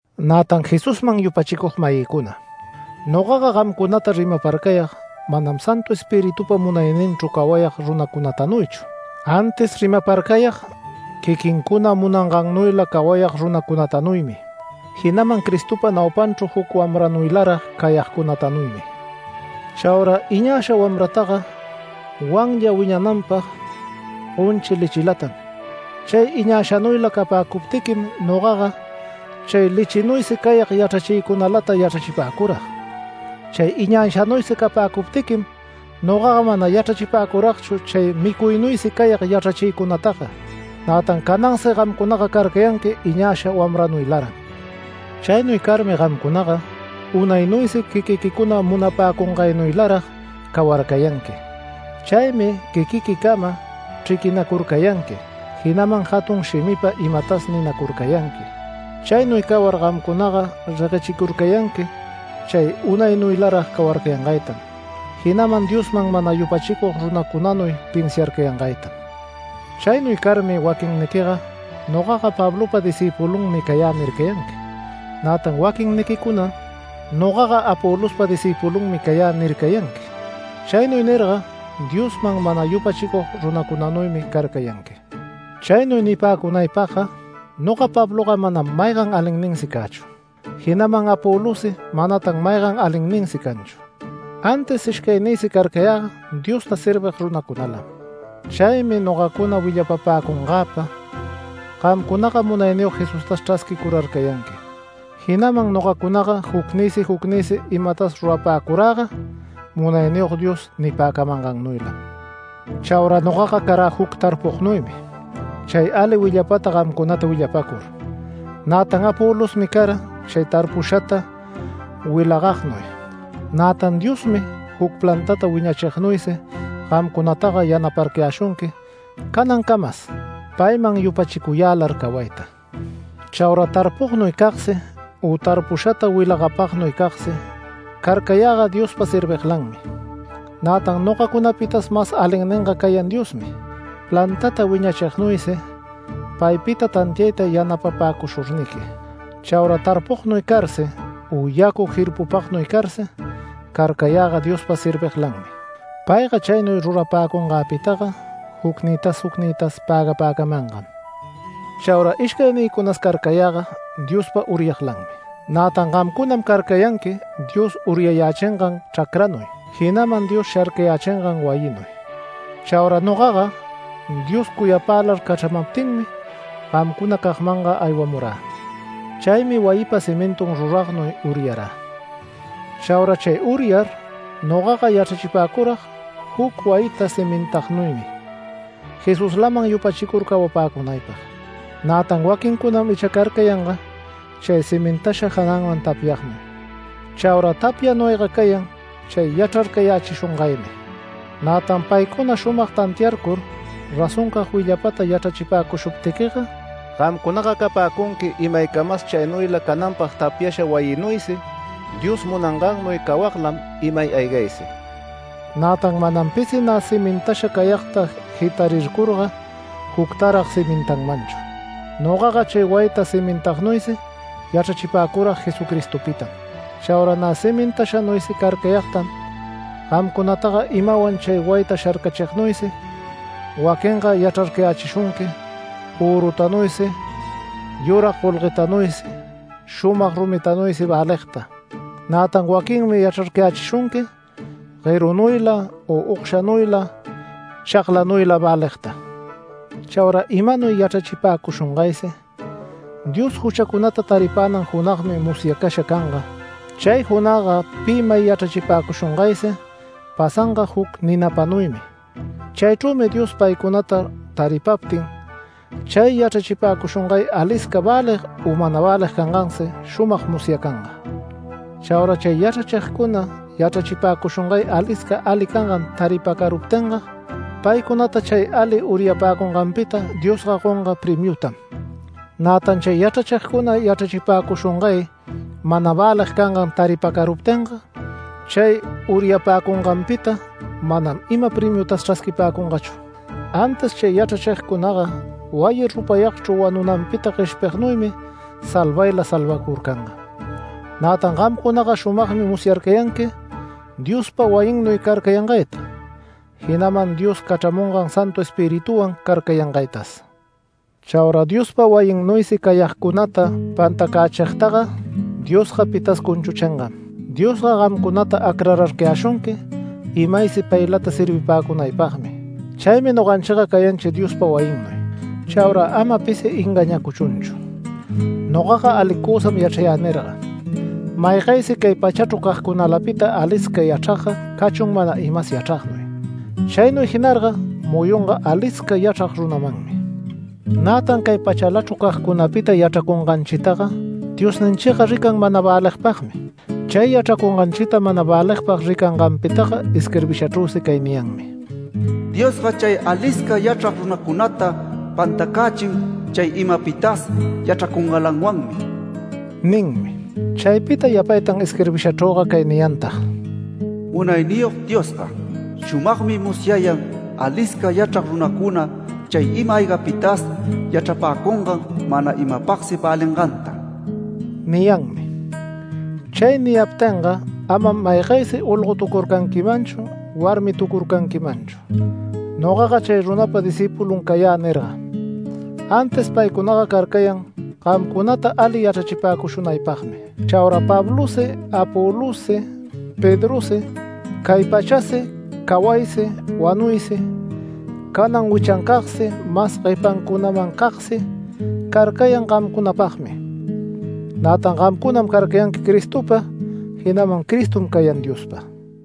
Nätan Jesusman yupachicug-mayïcuna, nogaga gamcunata rimaparcayag manam Santu Espiritupa munayninchru cawayag runacunatanuychu, antis rimaparcayag quiquincuna munangannuyla cawayag runacunatanuymi, jinaman Cristopa naupanchru juc wamranuylarag cayagcunatanuymi. Chaura iñasha wamrataga wanlla wiñananpag gonchi lechilatam. Chay iñashanuyla capäcuptiquim, nogaga chay lechinuysi cayag yachrachiycunalata yachrachipäcurag. Chay iñashanuysi capäcuptiquim nogaga mana yachrachipäcuragchu chay micuynuysi cayag yachrachiycunataga. Nätan canansi gamcunaga carcayanqui iñasha wamranuylaran. Chaynuy carmi gamcunaga unaynuysi quiquiquicuna munapäcungaynuylarag cawarcayanqui. Chaymi quiquiquicama chriquinacurcanqui, jinaman jatun shimipa imatas ninacurcayanqui. Chaynuy cawar gamcunaga reguechicurcayanqui chay unaynuylarag cawarcayangaytam, jinaman Diosman mana yupachicug runacunanuy pinsiarcayangaytam. Chaynuy carmi waquinniquiga “Nogaga Pablopa discïpulunmi cayä” nircayanqui, nätan waquinniquicunam “Nogaga Apolospa discïpulunmi cayä” nircayanqui. Chaynuy nirga, Diosman mana yupachicug runacunanuymi carcayanqui. Chaynuy nipäcunaypagga: “Noga Pabloga manam maygan alinninsi cächu”, jinaman Apolossi manatan maygan alinninsi canchu. Antis ishcaynïsi carcayäga Diosta servig runacunalam. Chaymi nogacuna willapapäcungäpa gamcunaga Munayniyog Jesustas chrasquicurarcayanqui. Jinaman nogacunaga jucnïsi jucnïsi imatas rurapäcuräga Munayniyog Dios nipäcamangannuylam. Chaura nogaga carä juc tarpugnuymi, chay ali willapata gamcunata willapäcur. Nätan Apolosmi cara chay tarpushata wilagagnuy. Nätan Diosmi juc plantata wiñachignuysi gamcunataga yanaparcayäshunqui canancamas, payman yupachicuyälar cawayta. Chaura tarpugnuycagsi u tarpushata wilagapagnuycagsi carcayäga Diospa serviglanmi. Nätan nogacunapitas mas alinninga cayan Diosmi, plantata wiñachignuysi paypita tantiayta yanapapäcushurniqui. Chaura tarpugnuy carsi u yacu jirpupagnuy carsi carcayäga Diospa serviglanmi, payga chaynuy rurapäcungäpitaga jucnïtas jucnïtas pägapäcamangam. Chaura ishcaynïcunas carcayäga Diospa uryaglanmi. Nätan gamcunam carcayanqui Dios uryayächingan chracranuy, jinaman Dios sharcayächingan wayinuy. Chaura nogaga Dios cuyapälar cachramaptinmi gamcunacagmanga aywamurä. Chaymi wayipa cimintun ruragnuy uryarä. Chaura chay uryar nogaga yachrachipäcurag juc wayita cimintagnuymi Jesuslaman yupachicur cawapäcunaypag. Nätan waquincunam icha carcayanga chay cimintasha jananman tapyagnuy. Chaura tapyanuyga cayan chay yachrarcayächishungaymi. Nätan paycuna shumag tantiarcur razoncag willapata yachrachipäcushuptiquiga gamcunaga capäcunqui imaycamas chaynuyla cananpag tapyasha wayinuysi Dios munangannuy cawaglam imay aygaysi. Nätan manam pisi nä cimintasha cayagta jitarircurga juctarag cimintanmanchu. Nogaga chay wayita cimintagnuysi yachrachipäcurag Jesucristopitam. Chaura nä cimintashanuysi carcayagtam gamcunataga imawan chay wayita sharcachignuysi. Waquinga yachrarcayächishunqui, örutanuysi yurag golguetanuysi shumag rumitanuysi väligta. Nätan waquinmi yachrarcayächishunqui guerunuyla, u ogshanuyla, chaglanuyla väligta. Chaura imanuy yachrachipäcushungaysi Dios juchacunata taripänan junagmi musyacasha canga. Chay junagga pi may yachrachipäcushungaysi pasanga juc ninapanuymi. Chaychrümi Dios paycunata taripaptin, chay yachrachipäcushungay alisca välig u mana välig cangansi shumag musyacanga. Chaura chay yachrachigcuna yachrachipäcushungay alisca ali cangan taripacaruptinga paycunata chay ali uryapäcunganpita Diosga gonga premiutam. Nätan chay yachrachigcuna yachrachipäcushungay mana välig cangan taripacaruptinga, chay uryapäcunganpita manam ima premiutas chrasquipäcungachu, antis chay yachrachigcunaga wayi rupayagchru wanunanpita gueshpignuymi salvayla salvacurcanga. Nätan gamcunaga shumagmi musyarcayanqui Diospa wayinnuy carcayangayta, jinaman Dios cachramungan Santu Espirituwan carcayangaytas. Chaura Diospa wayinnuysi cayagcunata pantacächigtaga Diosga pitas cunchuchingam. Diosga gamcunata acrarcayäshunqui imaysi paylata servipäcunaypagmi. Chaymi noganchiga cayanchi Diospa wayinnuy. Chaura ama pisi engañäcuchunchu “Nogaga alicusam yachrayä” nirga. Maygaysi cay pachachru cagcunalapita alisca yachragga cachun mana imas yachragnuy, chaynuy jinarga muyunga alisca yachrag runamanmi. Nätan cay pachalachru cagcunapita yachracunganchitaga Diosninchiga rican mana väligpagmi. Chay yachracunganchita mana väligpag ricayanganpitaga isquirbishachrüsi cay niyanmi: “Diosga chay alisca yachrag runacunata pantacächin chay imapitas yachracungälawanmi” ninmi. Chaypita yapaytan isquirbishachrüga cay niyantag: “Munayniyog Diosga. shumagmi musyayan alisca yachrag runacuna chay ima-aygapitas yachrapäcungan mana imapagsi välinganta” niyanmi. Chay niyaptinga amam maygaysi olgotucurcanquimanchu warmitucurcanquimanchu “Nogaga chay runapa discïpulunmi cayä” nirga. Antis paycunaga carcayan gamcunata ali yachrachipäcushunaypagmi. Chaura Pablosi Apolossi Pedrosi, cay pachasi cawaysi wanuysi canan wichancagsi, mas guepacunamancagsi carcayan gamcunapagmi. Nätan gamcunam carcayanqui Cristopa, jinaman Cristom cayan Diospa.